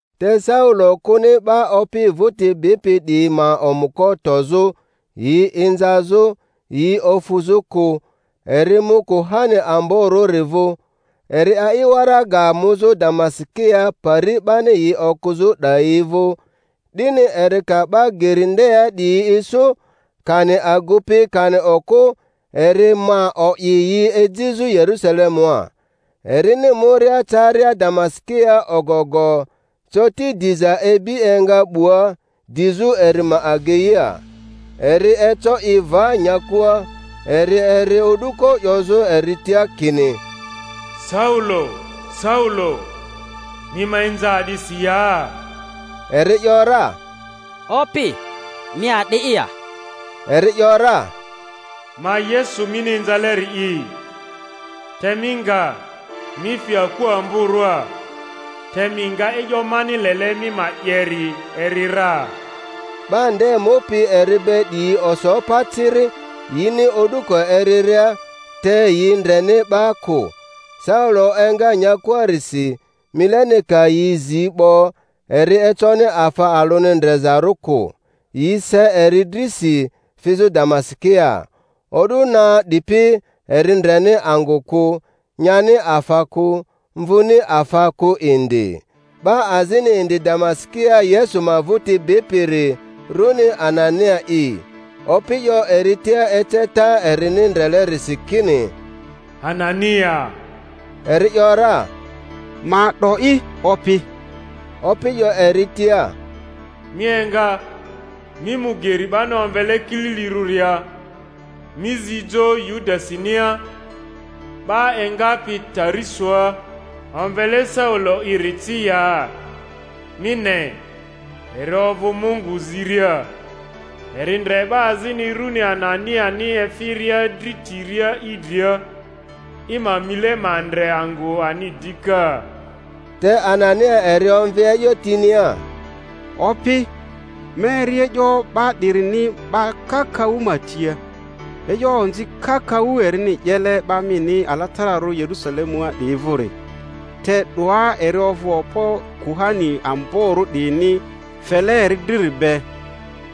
Te Saulo kᴜni 'ba Opi vᴜti bipi 'diyi ma omᴜko tozᴜ, yi inzazᴜ, yi ofᴜzᴜ kᴜ; eri mu kuhani amborᴜri vᴜ., eri a'i waraga muzᴜ Damasikia pari 'bani yi okᴜzᴜ 'dayi vᴜ, 'dini eri ka 'ba Geri ndea 'diyi isu, kani agupi kani okᴜ, eri ma o'i yi ejizᴜ Yerusalemua. Erini muria caria Damasikia ogo-go, coti diza ibi enga 'bua dizᴜ eri ma ageia. Eri eco i va nyakua, eri eri o'duko 'yozᴜ eri tia kini, Saulo, Saulo, mi ma inza a'disi ya? Eri ‘yora, Opi, mi a'di'i ya? Eri ‘yora, Ma Yesu mini inzaleri'i; te mi nga, mi fi aku amborᴜa, te mi nga e'yo mani lele mi ma 'yeri eri ra. 'Ba nde mupi eri be 'diyi oso pa ciri, yini o'duko eriria, te yi ndreni 'ba kᴜ. Saulo enga nyakuarisi, mileni ka yi zi 'bo eri econi afa alᴜni ndrezarᴜ kᴜ. Yi se eri drisi, fizᴜ Damasikia. O'du na 'dipi eri ndreni angᴜ kᴜ, nyani afa kᴜ, mvᴜni afa kᴜ indi. 'Ba azini indi Damasikia Yesu ma vᴜti bipiri, rᴜni Anania'i. Opi 'yo eri tia eceta erini ndrelerisi kini, Anania. Eri ‘yora, Ma 'do'i, Opi. Opi 'yo eri tia, Mi enga, mi mu geri 'bani omvele Kililirᴜria, mi zi jo Yudasinia 'ba engapi Tarisoa omvele Saulo'iri ci ya; mi ne, eri ovᴜ Mungu ziria, eri ndre 'ba azini rᴜni Ananiani efiria dri tiria i dria, i ma mile ma ndre angᴜ ani dika. Te Anania eri omvi e'yo tinia, Opi, ma eri e'yo 'ba 'dirini 'ba kakaᴜ ma tia, e'yo onzi kakaᴜ erini 'yele 'ba mini alatararᴜ Yeru-salemua 'diyi vᴜri; te 'doa eri ovᴜ okpo kuhani amborᴜ 'diyini fele eri driri be,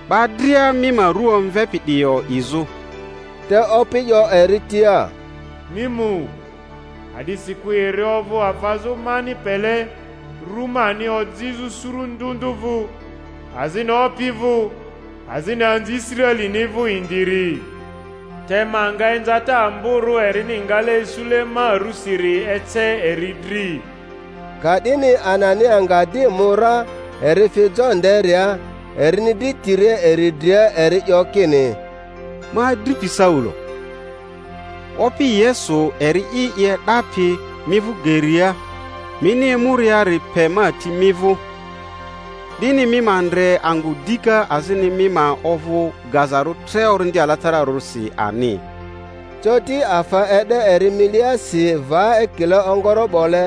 'ba dria mi ma rᴜ omvepi 'diyi o'izᴜ. Te Opi 'yo eri tia, Mi mu, a'disikᴜ eri ovᴜ afazᴜ mani pele ru mani ojizᴜ suru ndᴜ ndᴜ vᴜ, azini opi vᴜ, azini anzi Israelini vᴜ indiri; te ma nga inzata amborᴜ erini ngale isule ma rusiri ece eri dri. Ka'dini Anania nga di mu ra, eri fi jo nderia, erini dri tiria eri dria eri 'yo kini, Ma adripi Saulo, Opi Yesu, eri'i i e'dapi mi vᴜ geria mini emuriari pe ma ti mi vᴜ, 'dini mi ma ndre angᴜ dika azini mi ma ovᴜ gazarᴜ tre Orindi Alatararᴜsi ani. Coti afa e'de eri miliasi va ekile ongoro'bole,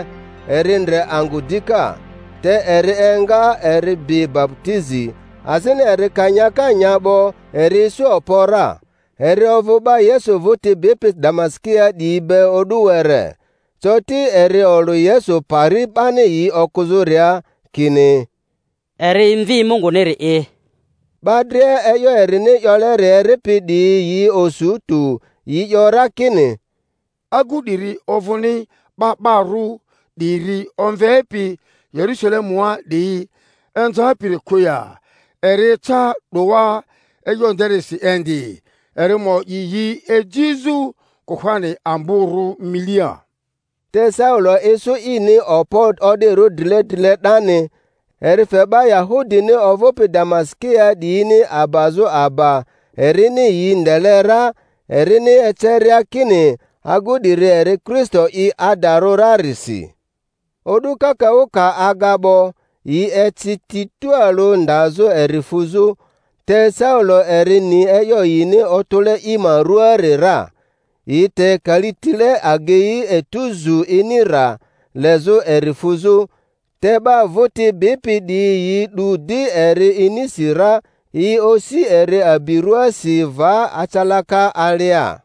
eri ndre angᴜ dika. Te eri enga, eri bi baputizi, azini eri ka nyaka nya 'bo eri isu okpo ra. Eri ovᴜ 'ba Yesu vᴜti bipi Damasikia 'diyi be o'du were. Coti eri olᴜ Yesu pari 'bani yi okᴜzᴜria, kini, Eri Mvi Munguniri'i. 'Ba dria e'yo erini 'yoleri eripi 'diyi yi osu tᴜ, yi 'yo ra kini, Agu 'diri ovᴜni 'ba 'ba ru 'diri omvepi Yerusalemua 'diyi inzapiri kᴜ ya? Eri eca 'doa e'yo nderisi indi, eri ma o'i yi ejizᴜ kuhani amborᴜ milia. Te Saulo isu ini okpo o'dirᴜ drile drile 'dani, eri fe 'ba Yahudini ovᴜpi Damasikia 'diyini abazᴜ aba erini yi ndele ra, erini eceria kini agu 'diri eri Kristo'i adarᴜ rarisi. O'du kakaᴜ ka aga 'bo, yi eci ti tualᴜ ndazᴜ eri fuzᴜ, te Saulo eri ni e'yo yini otᴜle i ma ruaari ra. Yi te kalitile agei etu zu ini rra, lezᴜ eri fuzᴜ; te 'ba vᴜti bipi 'diyi yi 'du di eri inisi ra, yi osi eri abi rᴜaasi va acalaka alia.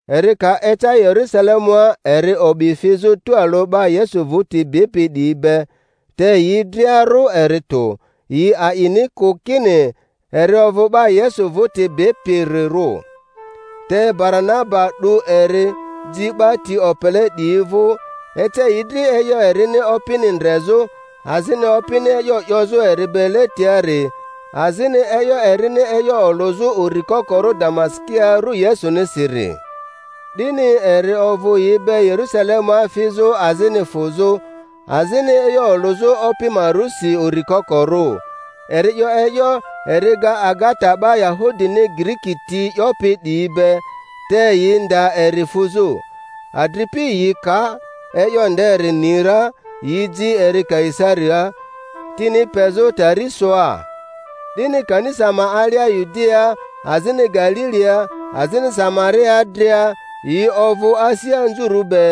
Eri ka eca Yerusalemua eri o'bi fizᴜ tualᴜ 'ba Yesu vᴜti bipi 'diyi be, te yi dria rᴜ eri tᴜ, yi a'ini kᴜ kini eri ovᴜ 'ba Yesu vᴜti bipirirᴜ. Te Baranaba 'du eri, ji 'ba ti opele 'diyi vᴜ, ece yi dri e'yo erini Opini ndrezᴜ, azini Opini e'yo 'yozᴜ eri be letiari, azini e'yo erini e'yo olᴜzᴜ uri kokorᴜ Damasikia ru Yesunisiri. 'Dini eri ovᴜ yi be Yerusalemua fizᴜ azini fᴜzᴜ, azini e'yo olᴜzᴜ Opi ma rusi uri kokorᴜ. Eri 'yo e'yo, eri ga agata 'ba Yahudini Giriki ti 'yopi 'diyi be; te yi nda eri fuzᴜ. Adripi yi ka e'yo nderi ni ra, yi ji eri Kaisariaa, tini pezᴜ Tarisoa. 'Dini kanisa ma alia Yudiaa, azini Galilia, azini Samariaa dria, yi ovᴜ asi anzurᴜ be,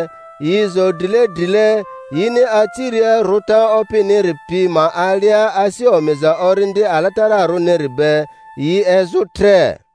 yi zo drile drile; yini aciria rᴜta Opiniri pi ma alia asi omiza Orindi Alatararᴜniri be, yi ezᴜ tre.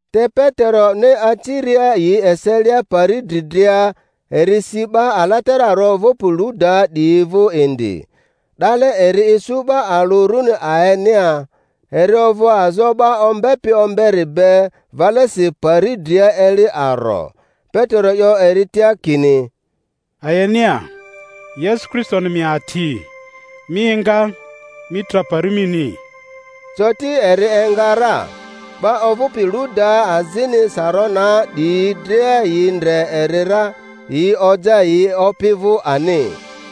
Te Peteroni aciria yi eselia pari dri dria, eri si 'ba alatararᴜ ovᴜpi Ludaa 'diyi vᴜ indi. 'Dale eri isu 'ba alᴜ rᴜni Aenea, eri ovᴜ azo 'ba ombepi omberi be valesi pari dria eli aro. Petero 'yo eri tia kini, Aenea, Yesu Kristoni mi ati; mi enga, mi tra pari mini! Coti eri enga ra. 'Ba ovᴜpi Ludaa azini Saronaa 'diyi dria yi ndre eri ra, yi oja yi Opi vᴜ ani.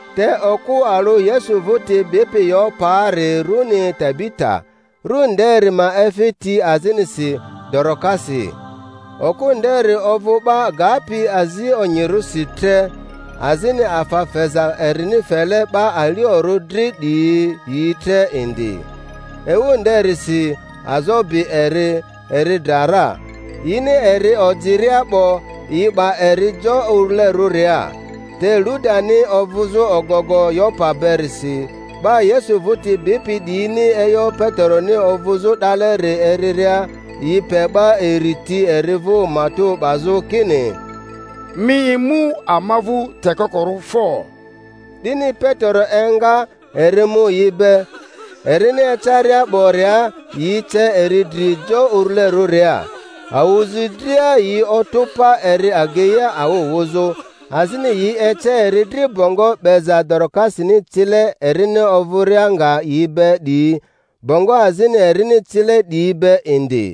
Te okᴜ alᴜ Yesu vᴜti bipi Yopaari rᴜni Tabita, ru nderi ma efi ti azinisi Dorokasi. Okᴜ nderi ovᴜ 'ba gapi azi onyirᴜsi tre, azini afa feza erini fele 'ba aliorᴜ dri 'diyi yi tre indi. Ewu nderisi azo bi eri, eri dra ra; yini eri ojiria 'bo, yi 'ba eri jo urulerᴜria. Te Ludani ovᴜzᴜ ogogo Yopa berisi, 'ba Yesu vᴜti bipi 'diyini e'yo Peteroni ovᴜzᴜ 'daleri eriria, yi pe 'ba iri ti eri vᴜ matᴜ 'bazᴜ kini, Mi emu ama vᴜ tekokorᴜ fo! 'Dini Petero enga, eri mu yi be. Erini ecaria 'boria yi ce eri dri jo urulerᴜria. Awᴜzi dria yi otᴜ pa eri ageia awᴜ wᴜzᴜ, azini yi ece eri dri bongo 'beza Doro-kasini cile erini ovᴜria nga yi be 'diyi, bongo azini erini cile 'diyi be indi.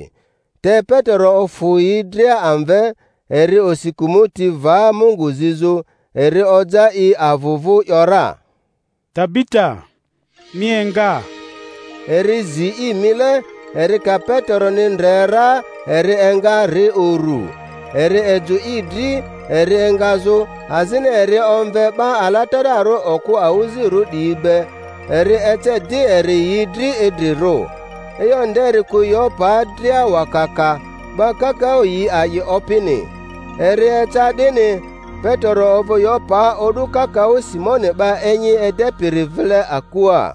Te Petero ofᴜ yi dria amve, eri osi kᴜmᴜti va Mungu zizᴜ; eri oja i avᴜ vᴜ ‘yora, Tabita, mi enga! Eri zi i mile, eri ka Peteroni ndre ra eri enga ri uru. Eri ejᴜ i dri eri engazᴜ, azini eri omve 'ba alatararᴜ okᴜ awᴜzirᴜ 'diyi be, eri ece di eri yi dri idrirᴜ. E'yo nderi ku Yopaa dria wakaka, 'ba kakaᴜ yi a'i Opini. Eri eca 'dini, Petero ovᴜ Yopaa o'du kakaᴜ Simoni 'ba enyi edepiri vile akua.